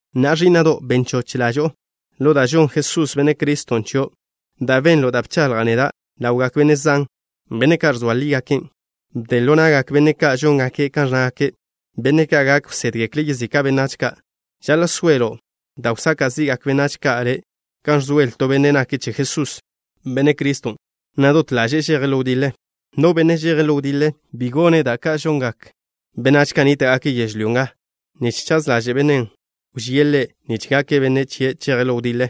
Na'a, ẕí'na'do', ben choch ḻaẕdo'o ḻo da' žonn Jesús, Benne' Criston', chio'. Da' benlo' da' bchaḻja' neda' ḻawgak benne' zan, benne' ka' ẕzoa lígaken', bden ḻo na'gak benne' ka' žóngake' kan ẕnnágake', benne' ka' gak wsédgekle' yezika' benách ka'. Žaḻa' soelo' da' wsaka' zi'gak benách ka' le' kan ẕzoelen to benne' nake' che Jesús, Benne' Criston', na' dot ḻaže'e žeje' ḻo wdiḻe. No benne' žeje' ḻo wdiḻe, bi chejchaze' da' ka' žongak benách ka' nníta'gake' yežlyó nga, nich chaz ḻaže' bennen' wžíe' ḻe' nich gake' benne' chie' žeje' ḻo wdiḻe.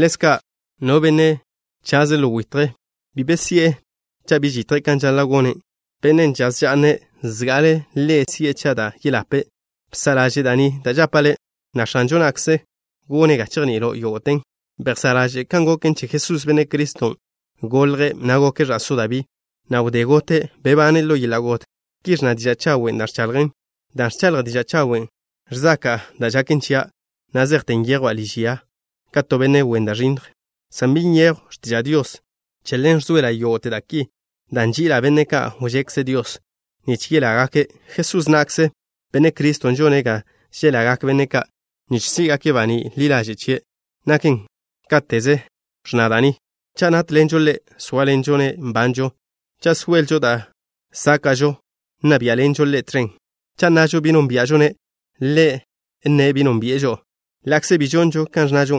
Ḻezka', no benne' chaze' ḻo witje, bi be si'e cha' bi žitje' kan žaḻa' gone'. Benne' žaz ža'ne', zga'ale' ḻe' si'e che da' yeḻape'. Bsa' ḻaže' da' ni da' žapa' le', na' X̱anžo na'kze gone' ga chejni'ilo' yógo'ten. Bejsá' ḻaže' kan goken che Jesús, Benne' Criston'. Golje', na' goke' ẕa'só Dabí, na' wdé gote', bebane' ḻo yeḻa' got. Ki ẕnna diža' chawen' da' ẕchaḻjan'. Dan' ẕchaḻja' diža' chawen', ẕzaka'a da' žaken chia', na' zejte nyejwa' liž ya nga ka to benne' wen da' ẕinnj, san bi nyejw x̱tiža' Dios. Che ḻen ẕzoela' yógo'te da' ki dan' nži'ila' benne' ka' wžekze Dios, nich yelágake'. Jesús na'kze, Benne' Criston', žone' ga želagak benne' ka' nich sí'gake' baní' ḻi ḻaže' chie'. Naken káteze ẕnna da' ni: Cha' nátḻenžo Ḻe', sóaḻenžo-ne' nbanžo. Cha' soelžo da' sáka'žo, nna biá'ḻenžo Ḻe' tẕen. Cha' nnažo bi nónbia'žo-ne', Ḻe' nne' bi nónbi'e žo'o. Ḻa'kze bi žonžo kan ẕnnažo,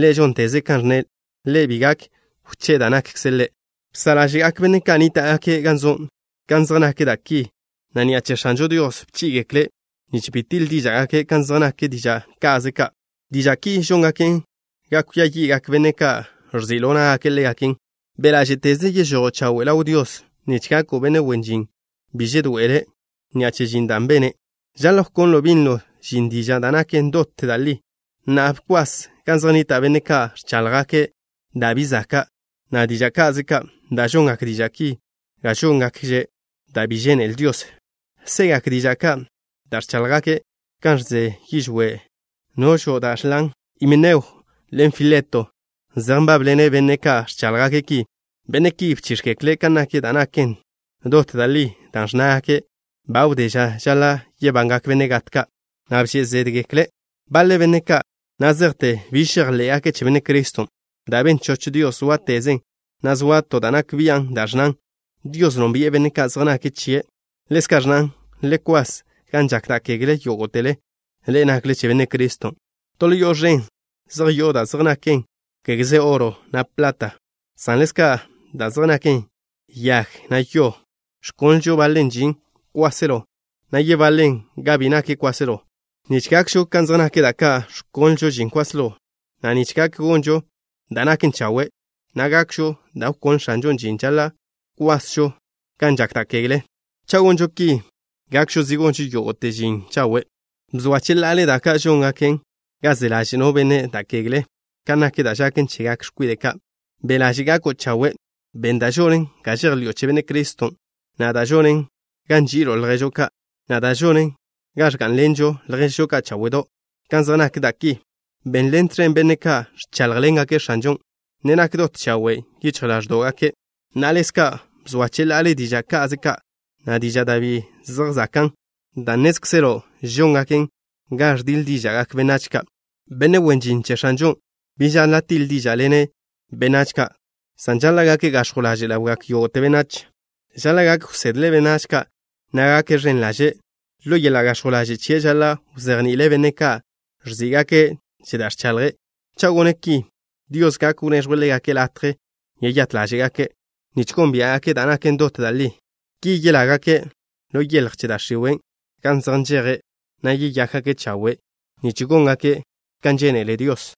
Ḻe' žónteze' kan ẕnne'. Ḻe' bi gak wché'e da' nakkze' Ḻe'. Bsa' ḻáže'gak benne' ka' nníta'gake' gan zo' kan zej nak da' ki, na' ni'a che X̱anžo Dios bchí'i-gekle' nich bi tiḻ díža'gake' kan zej nak diža' ka'ze ka'. Diža' ki žóngaken ga kwia yi'gak benne' ka' ẕzi' ḻo ná'gake' ḻégaken. Be' ḻáže'teze yežojo' chawe' ḻaw Dios nich gako' benne' wen žin bi žedoe'ele' ni'a che žin da' bene'. Žaḻa' wkonlo' binlo žin diža' da' naken dot da' li. Na'a, bkwas gan zej nnita' benne' ka' ẕcháḻjgake' da' bi zaka', na' diža' ka'ze ka', dan' žongak diža' ki ga góngakže' da' bi žénele Dios. Segak diža' ka' da' ẕcháḻjgake' kan žẕen yižwé' noẕo' da' žlan. Himeneo ḻen Fileto zej nbábḻene' benne' ka' ẕcháḻjgake' ki. Benne' ki bchíx̱gekle' kan nak da' naken dot da' li, dan' ẕnnágake' ba wdé ža žaḻa' yebangak benne' gat ka', na' bže' zédgekle' baḻe benách ka' na' zejte biž žejḻé'gake' che Benne' Criston'. Da' ben choch Dios zóatezen, na' zoa to da' nak bian', dan' ẕnnan: “Dios nónbi'e benne' ka' zej nake' chie'.” Ḻezka' ẕnnan: “Le kwas gan žak da' kegle, yógo'tele ḻe'e nakle che Benne' Criston'.” To ḻo yo'o ẕen zej yo'o da' zej naken, kégeze oro, na' plat, san ḻezka' da' zej naken yag, na' yo. Ẕkonlžo baḻen žin kwáselo, na' yebaḻen ga bi nak kwáselo. Nich gakžo kan zej nak da' ka' ẕkonlžo žin kwáselo, na' nich gak gonžo da' naken chawe', na' gakžo da' wkonle X̱anžon' žin, žaḻa' kwasžo gan žak da' kegle. Cha' gonžo ki, gakžo zi gonžo yógo'te žin chawe'. Bzoa cheḻa'ale da' ka' žóngaken ga se ḻaže' no benne' da' kegle kan nak da' žaken chegak x̱kwide' ka'. Be' ḻaže' gako' chawe'. Ben da' žonen ga žejḻi'o che Benne' Criston', na' da' žonen ga nži'ilo' lježo' ka', na' da' žonen ga ẕgá'nlenžo' lježžo ka' cháwe'do'. Kan zej nak da' ki, benḻen tẕen benne' ka' ẕcháḻjḻengake' X̱anžon', ne nak dot chawe' yichj ḻáẕdo'gake'. Na'a, ḻezka' bzoa cheḻa'ale diža' ka'ze ka', na' diža' da' bi zej zakan', dan' nnézkzelo' žóngaken ga ẕdiḻ díža'gak benách ka'. Benne' wen žin che X̱anžon' bi žaḻa' tiḻ díža'ḻene' benách ka', san žaḻa' gake' gax̱jw ḻaže' ḻawgak yógo'te benách. Žaḻa' gak wsedle' benách ka', na' gake' ẕen ḻaže'. Ḻo yeḻa' gax̱jw ḻaže' chie' žaḻa' wzejni'ile' benne' ka' ẕží'igake' che da' ẕchaḻje'. Cha' gone' ki, Dios gak wneẕjwe' ḻégake' latje yeyát ḻáže'gake' nich gónbia'gake' da' naken dot da' li. Ki yelágake' ḻo yeḻj che da' x̱iwe' gan zej nžeje', na' yeyákgake' chawe' nich góngake' kan žénele Dios.